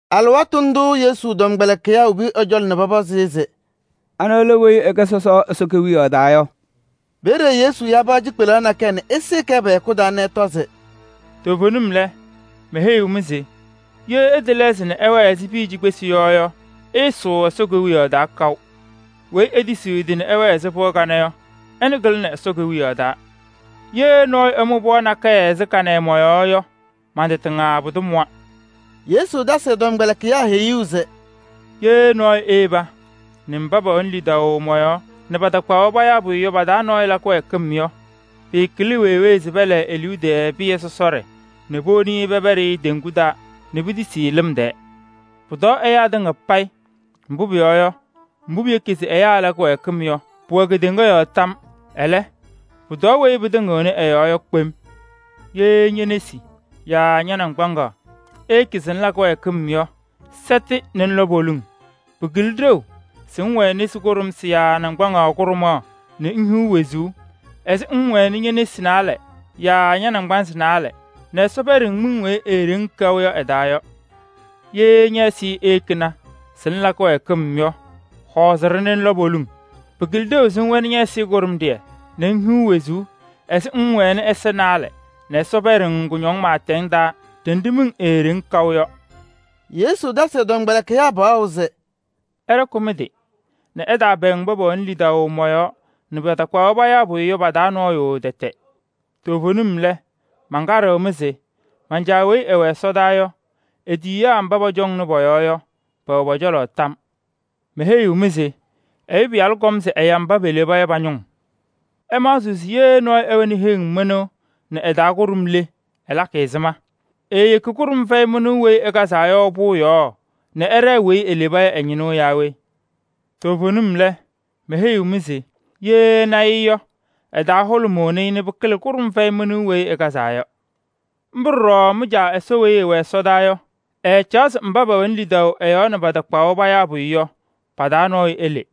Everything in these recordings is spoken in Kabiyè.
Alɩwaatʋ ndʋʋ Yesu tɔmkpɛlɩkɩyaa wobi ɛ-cɔlɔ nɛ pɔpɔzɩ-ɩ se: “Anɩ lɛ weyi ɛkɩlɩ Ɛsɔ Kewiyaɣ taa yɔ?” Peeye Yesu ya pɩɣa cikpelaɣ nakɛyɛ nɛ ɛsɩɩ-kɛ pɛ-hɛkʋ taa nɛ ɛtɔ se: “Toovenim lɛ, meheyiɣ-mɩ se: ye ɩtɛlɛɣzɩ nɛ ɩwɛɛ ɛzɩ piya cikpesi yɔ yɔ, ɩɩsʋʋ Ɛsɔ Kewiyaɣ taa kaʋ. Weyi etisiɣ ɛ-tɩ nɛ ɛwɛɛ ɛzɩ pɩɣa kanɛ yɔ, ɛnʋ kɩlɩnɩ ka-taa. Ye nɔɔyʋ ɛmʋ pɩɣa nakɛyɛ ɛzɩ kanɛ yɔ mɔ-yɔɔ yɔ, man-tɩ tɩŋa pʋdʋ mʋwa.” Yesu tasɩ ɛ-tɔmkpɛlɩkɩyaa heyuu se: “Ye nɔɔyʋ eyeba nɛ mba pɛwɛnɩ lidaʋ mɔ-yɔɔ nɛ patakpaɣ-wɛ payaa pʋyʋ yɔ pa-taa nɔɔyʋ la kɩwɛɛkɩm yɔ, pɩkɩlɩ wee wee se pɛlɛɛ e-liu tɛɛ pɩyɛ sɔsɔɖɛ nɛ powoni-i pɛpɛɖɩ teŋgu taa nɛ pitisi-i lɩm tɛɛ. Pʋtɔɔ ɛyaa tɩŋa payɩ! Mbʋ pʋyɔɔ yɔ, mbʋ piyeki se ɛyaa ɛla kɩwɛɛkɩm yɔ, pʋwɛɣ kedeŋa yɔɔ tam. Ɛlɛ, pʋtɔɔ weyi pɩtɩŋɩɣnɩ ɛ-yɔɔ yɔ kpem! “Ye ñe-nesi yaa ña-naŋgbaŋaɣ eyekini se ŋla kɩwɛɛkɩm yɔ, sɛtɩ nɛ ŋlɔ poliŋ. Pɩkɩlɩ ɖeu se ŋwɛnɩ nesi kʋɖʋmsɩ yaa naŋgbaŋaɣ kʋɖʋmaɣ nɛ ŋhiɣ wezuu ɛzɩ ŋŋwɛnɩ ñe-nesi naalɛ yaa ña-naŋgbanzɩ naalɛ nɛ Ɛsɔ pɛɖɩ-ŋ miŋ weyi eeɖeŋ kaʋ yɔ ɛ-taa yɔ. Ye ñɛ-ɛzɩyɛ eyekini se ŋla kɩwɛɛkɩm yɔ, hɔɔzɩ-ɖɩ nɛ ŋlɔ poliŋ. Pɩkɩlɩ ɖeu se ŋwɛnɩ ɛzɩyɛ kʋɖʋmɖɩyɛ nɛ ŋhiɣ wezuu ɛzɩ ŋŋwɛnɩ ɛza naalɛ nɛ Ɛsɔ pɛɖɩ-ŋ kʋñɔŋ pɩɩtɛŋ taa ɖenɖe miŋ eeɖeŋ kaʋ yɔ yɔ.” Yesu tasɩ ɛ-tɔmkpɛlɩkɩyaa paɣʋ se: “Ɩɖɔkɩ mɩ-tɩ nɛ ɩtaapɛɛŋ mba pɛwɛnɩ lidaʋ mɔ-yɔɔ nɛ patakpaɣ-wɛ payaa pʋyʋ yɔ pa-taa nɔɔyʋ tɛtɛ. Toovenim lɛ, mankaɖɩɣ-mɩ se: man-Caa weyi ɛwɛ ɛsɔdaa yɔ, e-tiyiyaa mba pɔcɔŋnɩ pɔ-yɔɔ yɔ, pɛwɛ ɛ-cɔlɔ tam. [ Meheyiɣ-mɩ se: Ɛyʋ Pɩyalʋ kɔm se ɛya mba peleba yɔ pa-ñʋʋ.] “Ɩmaɣzɩɣ se ye nɔɔyʋ ɛwɛnɩ heŋ mɩnʋʋ nɛ ɩ-taa kʋɖʋm le, ɛlakɩ ɛzɩma? Eeyeki kʋɖʋm fɛyɩ mɩnʋʋ weyi ɩkazaa yɔ pʋʋ yɔɔ nɛ ɛɖɛɛ weyi eleba yɔ ɛ-ñɩnʋʋ naa we? Toovenim lɛ, meheyiɣ-mɩ se: ye ɛna-ɩ yɔ, ɛ-taa hʋlʋmʋʋnɩ-ɩ nɛ pɩkɩlɩ kʋɖʋm fɛyɩ mɩnʋʋ weyi ɩkazaa yɔ. Mbʋ ɖɔɖɔ mɩ-Caa Ɛsɔ weyi ɛwɛ ɛsɔdaa yɔ, ɛɛcaɣ se mba pɛwɛnɩ lidaʋ ɛ-yɔɔ nɛ patakpaɣ-wɛ payaa pʋyʋ yɔ, pa-taa nɔɔyʋ ele.”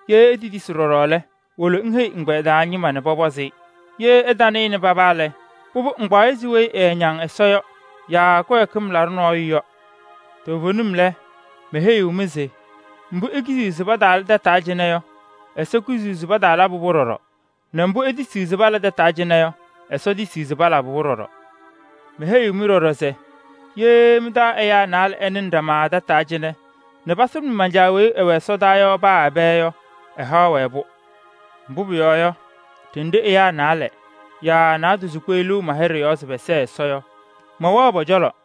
Ye etetisi ɖɔɖɔ lɛ, ŋwolo ŋheyi ɛgbɛyɛ taa ñɩma nɛ pɔpɔzɩ-ɩ. Ye ɛtanɩnɩ paba lɛ, pʋbʋ, ŋkpaɣ-ɩ ɛzɩ weyi ɛɛñaŋ Ɛsɔ yɔ yaa kɩwɛɛkɩm laɖʋ nɔɔyʋ yɔ. “Toovenim lɛ, meheyiɣ-mɩ se: mbʋ ikiziɣ se pataala tataa cɩnɛ yɔ, Ɛsɔ kiziɣ se pataalabɩ-pʋ ɖɔɖɔ, nɛ mbʋ itisiɣ se pala tataa cɩnɛ yɔ, etisiɣ se palabɩ-pʋ ɖɔɖɔ. “Meheyiɣ-mɩ ɖɔɖɔ se: ye mɩ-taa ɛyaa naalɛ ɛnɩnɩ ɖama tataa cɩnɛ nɛ pasʋlʋmɩ man-Caa weyi ɛwɛ ɛsɔdaa yɔ paa ɛbɛ yɔ, ɛhaɣ-wɛ-pʋ. Mbʋ pʋyɔɔ yɔ, ɖenɖe ɛyaa naalɛ yaa naadozo kpeɣliɣ ma-hɩɖɛ yɔɔ se pɛsɛɣ Ɛsɔ yɔ, mɛwɛɣ pɔ-cɔlɔ.”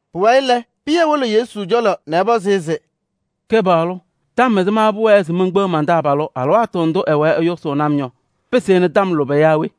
Pʋwayɩ lɛ, Pɩyɛ wolo Yesu cɔlɔ nɛ ɛpɔzɩ-ɩ se: “Kɩpaɣlʋ! Tɔm ɛzɩma pʋwɛɛ se menkpeɣ man-taabalʋ alɩwaatʋ ndʋ ɛwɛɛ ɛyʋsʋʋnɩ-m yɔ? Pɩsɩnɩ tɔm lʋbɛ yaa we?”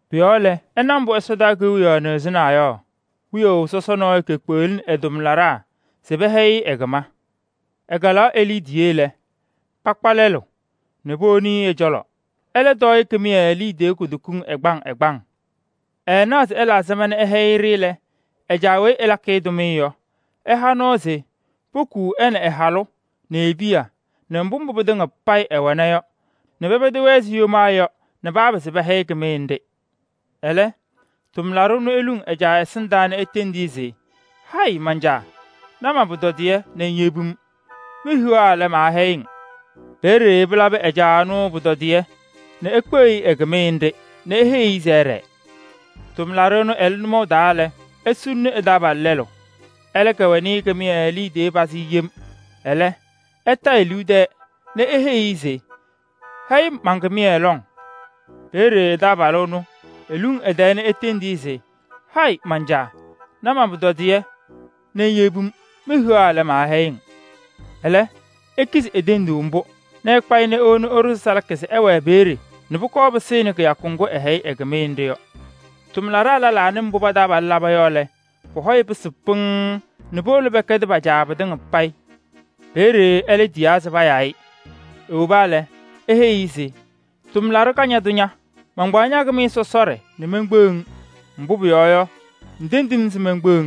Pʋ-yɔɔ lɛ, ɩna mbʋ Ɛsɔ Kewiyaɣ nɩɣzɩnaa yɔ: wiyaʋ sɔsɔ nɔɔyʋ kekpeɣlini ɛ-tʋmlaɖaa se pɛhɛyɩ-ɩ ɛ-kɩma. “Ɛkalaɣ e-liidiye lɛ, pakpa lɛlʋ nɛ powoni ɛ-cɔlɔ. Ɛlɛ tɔɔ-ɩ kɩmɩyɛ liidiye kutokiŋ ɛgbaŋ ɛgbaŋ. Ɛɛnaɣ se ɛla ɛzɩma nɛ ɛhɛyɩ-ɖɩ lɛ, ɛ-caa weyi ɛlakɩ-ɩ tʋmɩyɛ yɔ, ɛha nɔɔ se pokuu ɛ nɛ ɛ-halʋ nɛ e-piya nɛ mbʋ pɩtɩŋa payɩ ɛwɛna yɔ nɛ pɛpɛdɩ-wɛ ɛzɩ yomaa yɔ nɛ papɩzɩ pɛhɛyɩ kɩmɩyɛ nɖɩ. Ɛlɛ, tʋmlaɖʋ ɛnʋ eluŋ ɛ-caa ɛsɩndaa nɛ etendi-i se: ‘Hayɩ man-caa! Na man-pʋtɔdɩyɛ nɛ ŋyebi-m. Mehiɣa lɛ, maahɛyɩ-ŋ!’ Peeye pɩlabɩ ɛ-caa ɛnʋ pʋtɔdɩyɛ nɛ ekpeɣ-i ɛ-kɩmɩyɛ nɖɩ nɛ eheyi-i se ɛɖɛɛ. “Tʋmlaɖʋ ɛnʋ ɛlɩ nʋmɔʋ taa lɛ, esuluni ɛ-taabalʋ tʋmlaɖʋ lɛlʋ. Ɛlɛ kɛwɛnɩ-ɩ kɩmɩyɛ liidiye pazɩ yem. Ɛlɛ, ɛta e-liu tɛɛ nɛ eheyi-i se: ‘Hɛyɩ-m man-kɩmɩyɛ lɔŋ!’ Peeye taabalʋ ɛnʋ eluŋ ɛ-tɛɛ nɛ etendi-i se: ‘Hayɩ man-caa! Na man-pʋtɔdɩyɛ nɛ ŋyebi-m. Mehiɣa lɛ, maahɛyɩ-ŋ!’ Ɛlɛ, ekizi e-tenduu mbʋ nɛ ɛkpa-ɩ nɛ ewona ɛɖʋ-ɩ salaka se ɛwɛɛ peeye nɛ pʋkɔɔ pɩsɩnɩ kɩyakʋ ŋgʋ ɛhɛyɩ ɛ-kɩmɩyɛ nɖɩ yɔ. “Tʋmlaɖaa lɛlaa nɩ mbʋ pa-taabalʋ laba yɔ lɛ, pɔ-hɔ pɩsɩ pɩŋŋ nɛ powolo pɛkɛdɩ pa-caa pɩtɩŋa payɩ. Peeye ɛlɛ tiyaa se payaa-ɩ. Ewoba lɛ, eheyi-i se: ‘Tʋmlaɖʋ kañadʋ ña! Mankpaɣ ña-kɩmɩyɛ sɔsɔɖɛ nɛ menkpeɣ-ŋ, mbʋ pʋyɔɔ yɔ, ŋtendi-m se menkpeɣ-ŋ.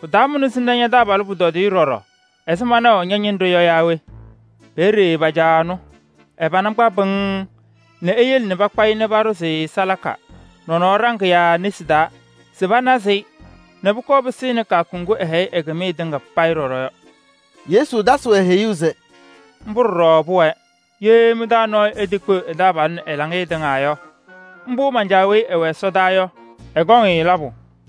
Pɩtaamʋna se ŋna ña-taabalʋ pʋtɔdɩyɛ ɖɔɖɔ ɛzɩ manaʋ ña-ñɩnɖɛ yɔ yaa we?’ Peeye pa-caa ɛnʋ, ɛ-pana kpa pɩŋŋ nɛ eyele nɛ pakpa-ɩ paɖʋzɩ salaka nɔnɔɔ ɖaŋɩyaa nesi taa se panazɩ-ɩ nɛ pʋkɔɔ pɩsɩnɩ kɩyakʋ ŋgʋ ɛhɛyɩ ɛ-kɩmɩyɛ tɩŋa payɩ ɖɔɖɔ yɔ.” Yesu tasɩ-wɛ heyuu se: “Mbʋ ɖɔɖɔ pʋwɛɛ. Ye mɩ-taa nɔɔyʋ etekpeɣ ɛ-taabalʋ nɛ ɛ-laŋɩyɛ tɩŋa yɔ, mbʋ man-Caa weyi ɛwɛ ɛsɔdaa yɔ, ɛkɔŋ-ɩ labʋ.”